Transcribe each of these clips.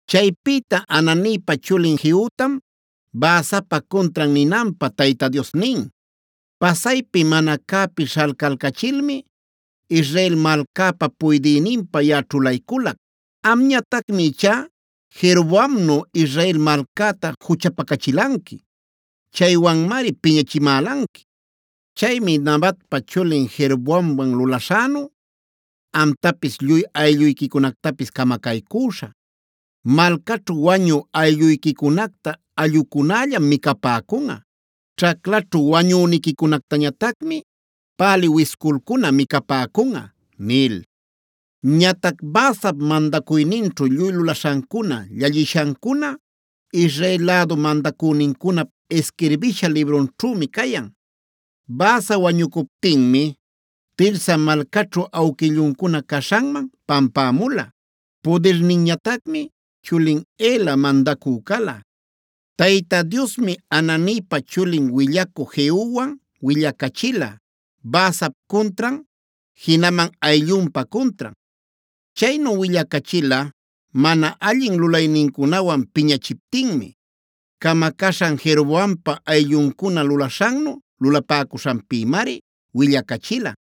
Chaypïta Hananipa chulin Jehutam Baasapa cuntran ninanpä Tayta Dios nin: “Pasaypi mana cäpi śhalcalcachilmi Israel malcäpa puydïninpä yaꞌa ćhulayculac. Amñatacmi ichá Jeroboamnu Israel malcäta juchapacachilanqui. Chaywanmari piñachimälanqui. Chaymi Nabatpa chulin Jeroboamwan lulaśhänu amtapis lluy aylluyquicunactapis camacaycüśhä. Malcaćhu wañü aylluyquicunacta allꞌucunallam micapäcunꞌa. Ćhaclaćhu wañüniquicunactañatacmi pälï wisculcuna micapäcunꞌa” nil. Ñatac Baasap mandacuyninćhu lluy lulaśhancuna, llallishancuna Israel lädu mandacünincunap isquirbisha librunćhümi cayan. Baasa wañucuptinmi Tirsa malcaćhu awquilluncuna caśhanman pampämula. Pudirninñatacmi chulin Ela mandacü cala. Tayta Diosmi Hananipa chulin willacü Jehuwan willacachila Baasap cuntran, jinaman ayllunpa cuntran. Chaynu willacachila mana allin lulaynincunawan piñachiptinmi. Camacaśhan Jeroboampa aylluncuna lulaśhannu lulapäcuśhanpïmari willacachila.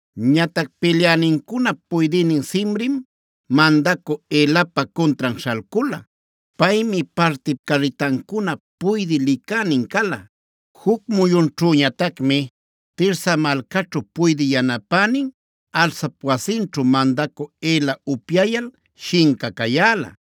Ñatac pilyänincunap puydïnin Zimrim mandacü Elapa cuntran śhalcula. Paymi parti carritancunap puydï licänin cala. Juc muyunćhüñatacmi Tirsa malcaćhu puydï yanapänin Arsap wasinćhu mandacü Ela upyayal shinca cayäla.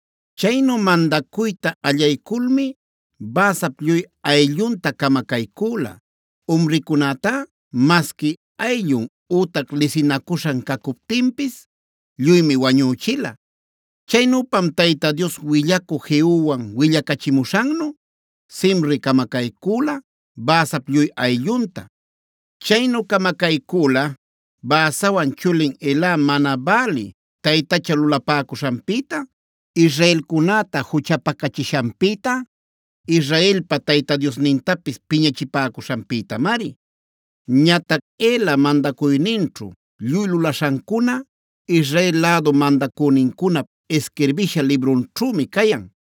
Chaynu mandacuyta allayculmi Baasap lluy ayllunta camacaycüla; umricunätá masqui ayllun ütac lisinacuśhan cacuptinpis lluymi wañüchila. Chaynüpam Tayta Dios willacü Jehuwan willacachimuśhannu Zimri camacaycüla Baasap lluy ayllunta. Chaynu camacaycüla Baasawan chulin Ela mana bälï taytacha lulapäcuśhanpïta, israelcunäta juchapacachishanpïta, Israelpa Tayta Diosnintapis piñachipäcuśhanpïtamari. Ñatac Ela mandacuyninćhu lluy lulaśhancuna Israel lädu mandacünincunap isquirbisha librunćhümi cayan.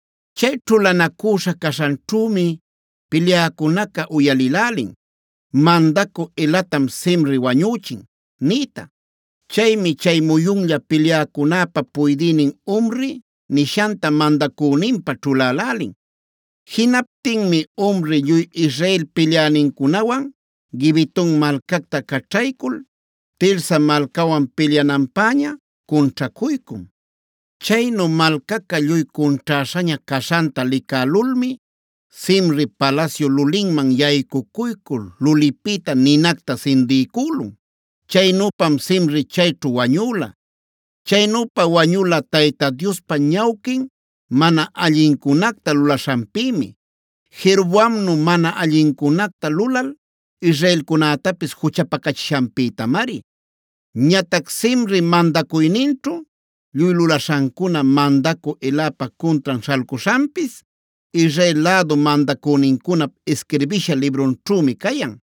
Chay ćhulanacüśha caśhanćhümi pilyäcunaca uyalïlälin: “Mandacü Elatam Zimri wañüchin” nïta. Chaymi chay muyunlla pilyäcunäpa puydïnin Omri nishanta mandacüninpä ćhulälälin. Jinaptinmi Omri lluy Israel pilyänincunawan Gibeton malcacta caćhaycul Tirsa malcawan pilyananpäña cunćhacuycun. Chaynu malcaca lluy cunćhäśhaña caśhanta licälulmi Zimri palasyu lulinman yaycucuycul lulipïta ninacta sindiycülun.a Chaynüpam Zimri chayćhu wañüla. Chaynüpa wañula Tayta Diospa ñawquin mana allincunacta lulaśhanpïmi; Jeroboamnu mana allincunacta lulal israelcunätapis juchapacachishanpïtamari. Ñatac Zimri mandacuyninćhu lluy lulaśhancuna, mandacü Elapa cuntran śhalcuśhanpis Israel lädu mandacünincunap isquirbisha librunćhümi cayan.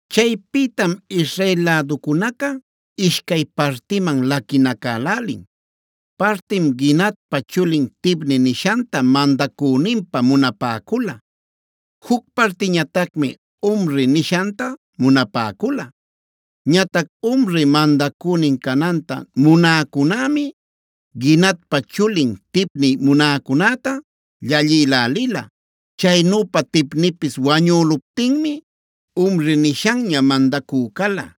Chaypïtam Israel läducunaca ishcay partiman laquinacälälin: Partim Ginatpa chulin Tibni nishanta mandacüninpä munapäcula; juc partiñatacmi Omri nishanta munapäcula. Ñatac Omri mandacünin cananta munäcunämi Ginatpa chulin Tibni munäcunäta llallïlälila. Chaynüpa Tibnipis wañüluptinmi Omri nishanña mandacü cala.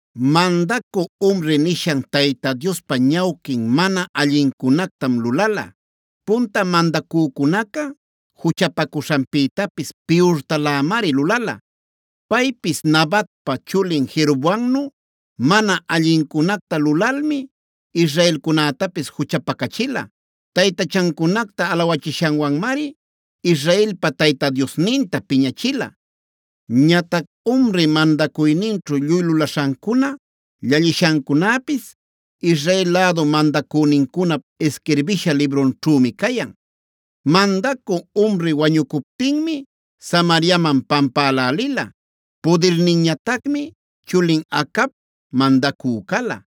Mandacü Omri nishan Tayta Diospa ñawquin mana allincunactam lulala. Punta mandacücunaca juchapacuśhanpïtapis piyurtalämari lulala. Paypis Nabatpa chulin Jeroboamnu mana allincunacta lulalmi israelcunätapis juchapacachila. Taytachancunacta alawachishanwanmari Israelpa Tayta Diosninta piñachila. Ñatac Omri mandacuyninćhu lluy lulaśhancuna, llallishancunäpis Israel lädu mandacünincunap isquirbisha librunćhümi cayan. Mandacü Omri wañucuptinmi Samariaman pampälälila. Pudirninñatacmi chulin Acab mandacü cala.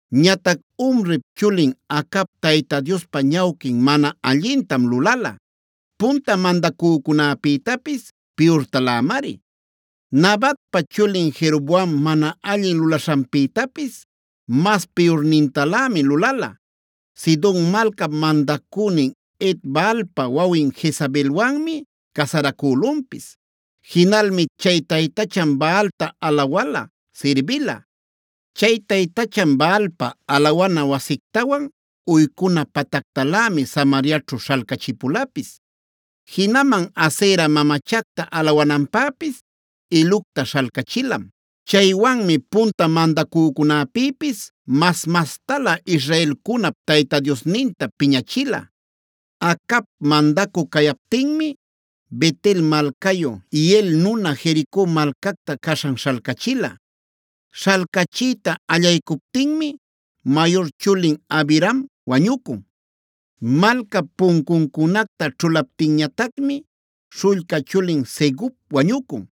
Ñatac Omrip chulin Acab Tayta Diospa ñawquin mana allintam lulala; punta mandacücunäpïtapis piyurtalämari. Nabatpa chulin Jeroboam mana allin lulaśhanpïtapis mas piyurnintalämi lulala; Sidon malcap mandacünin Et-baalpa wawin Jezabelwanmi casaracülunpis. Jinalmi chay taytachan Baalta alawala, sirbila. Chay taytachan Baalpa alawana wasictawan uycuna patactalämi Samariaćhu śhalcachipulapis. Jinaman Asera mamachacta alawananpäpis ilucta śhalcachilam. Chaywanmi punta mandacücunäpïpis mas-mastalä Israelcunap Tayta Diosninta piñachila. Acab mandacü cayaptinmi Bet-el malcayu Hiel nuna Jerico malcacta caśhan śhalcachila. Śhalcachiyta allaycuptinmi mayur chulin Abiram wañucun. Malcap puncuncunacta ćhulaptinñatacmi śhullca chulin Segub wañucun.